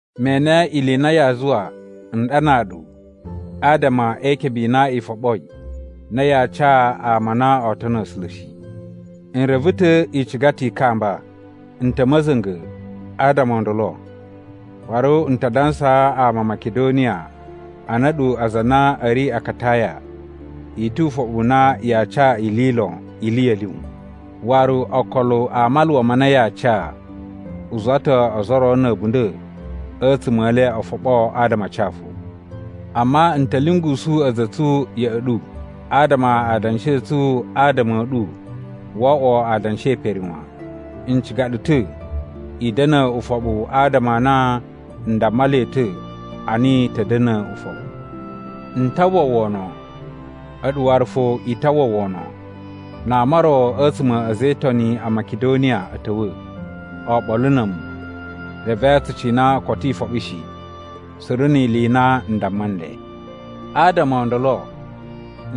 Me ene ili i na yaa zuwa n ɗanaa ɗu adama e ikebe i na i foɓoi na yaa ca ama a na oo tono A̱sula̱ shi. N reve ta̱ i ciga ta̱ i kamba. N ta̱ ma̱za̱nga̱ adama o ndolo, waru n ta dansaa ama a Makidoniya a na a̱ɗu aza a na a̱ ri Akataya i tu ufoɓu na yaa ca ili lon ili ya̱ lyun. Waru okolo a maluwa ma na yaa ca u zuwa ta̱ ozo o ro na̱ a̱bunda̱ a̱tsuma̱ e le o foɓo adama a ca fo. Amma n ta̱ lyungusu a̱za̱ a̱ tsu ya̱ꞌa̱ ɗu adama adanshi a̱ tsu adama a̱ ɗu wo oꞌwo adanshi e pere wan. N ciga ɗu ta̱ i da̱na̱ ufoɓu adama a na n damma le ta̱ a na i ta̱ da̱na̱ ufoɓu. N ta uwwa wono, a̱ɗu waru fo i ta uwwa wono, na ama o ro a̱tsuma̱ a̱ a̱za̱ e Itoni a Makidoniya a̱ ta̱wa̱ oɓolo na̱ a̱mu, reve tsu cina koto i foɓo shi, suru ni ili i na n damma nle! Adama o ndolo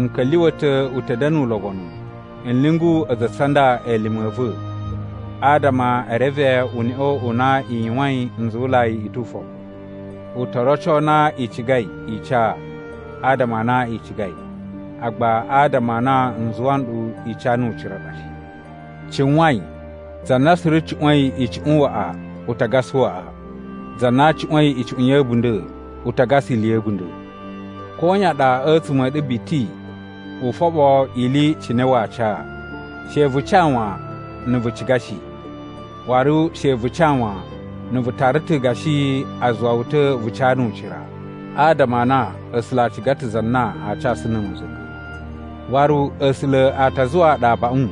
n ka̱lyuwa̱ ta̱ u ta̱ da̱na̱ ulobonu n lyungu a̱za̱ a̱ tsu a nda elime a̱ va̱ adama e reve uneꞌe u na i yuwain nzuwulai i tu ufoɓu. U to roco na i cigai i ca adama a na i cigai, agba adama a na n zuwa nɗu i ca nu ucira ɗa shi. Cuwain za na suru cuꞌwa̱in icuꞌun waꞌa u ta gasa waꞌa. Za na cuꞌwa̱in icuꞌun ya̱ a̱bunda̱ u ta gasa ili ya̱ a̱bunda̱. Koyan ɗa a̱tsuma̱ a̱ ɗu biti u foɓo ili cine waa ca. She vu ca wan, na̱ vu ciga shi. Waru she vu ca wan, na vu tara ta̱ gashi a zuwa wu ta̱ vu ca nu ucira. Adama a na A̱sula̱ a ciga ta̱ za na aa casu na̱ ma̱za̱nga̱. Waru A̱sula̱ a ta zuwaa ɗu abaꞌun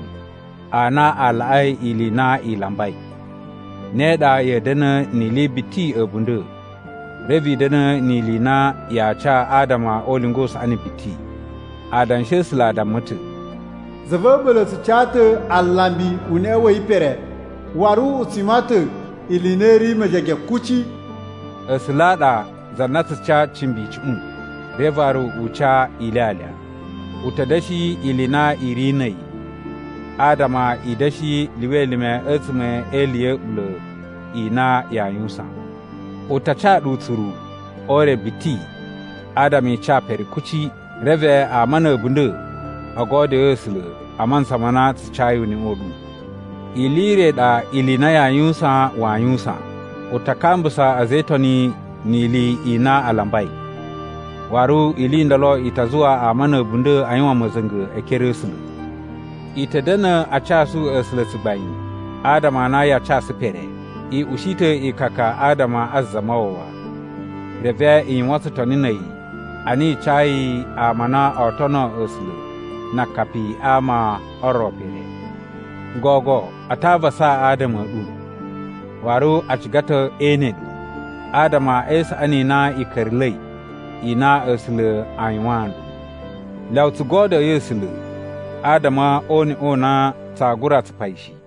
a na a laꞌai ili i na i lambai. Ne ɗa ya̱a̱ da̱na̱ ni ili biti a̱bunda̱, reve i da̱na̱ ni ili i na yaa ca adama o ulinga u saꞌani biti. Adanshi a̱ A̱sula̱ a damma ta̱, “Za va̱ a̱ɓula̱ tsu ca ta̱ alambi uneꞌe wa̱ yi pere, waru u tsu yuwan ta̱ ili i na i ri mejege kuci.” A̱sula̱ a ɗa za na tsu ca cimbi icuꞌun, reve waru u ca ilyalya. U ta̱ da̱shi ili i na i ri na̱ a̱yi, adama i da̱shi lyuwa elime a̱tsuma̱ e ili ya̱ a̱ɓula̱ i na yaa yuwusan. U ta ca ɗu utsuru o ure biti adama i ca pere kuci. Reve ama na̱ a̱bunda̱ o godyoo A̱sula̱ a mantsa ma na tsu cayi uneꞌe u ɗu. Ili i re i ɗa ili i na yaa yuwusan waa yuwusan. U ta kambusa a̱za̱ e Itoni ni ili i na a lambai. Waru ili i ndolo i ta zuwa ama na̱ a̱bunda̱ a yuwan ma̱za̱nga̱ e ekere a̱ A̱sula̱. I ta̱ da̱na̱ a casu A̱sula̱ tsugbain adama a na yaa casu pere. I ushi ta̱ ikaka adama a Zamawawa, reve i yuwan tsutoni na̱ a̱yi ana i cayi ama a na oo tono A̱sula̱ na akapi a ama o ro pere. Gogo a ta avasa adama a̱ ɗu, waru a ciga ta̱ ee ene ɗu, adama e isaꞌani i na i ka̱ra̱la̱i i na A̱sula̱ a yuwaan nɗu. Lyawa tsu godyoyi A̱sula̱ adama o uneꞌe u na tsaa gura tsupa yi shi.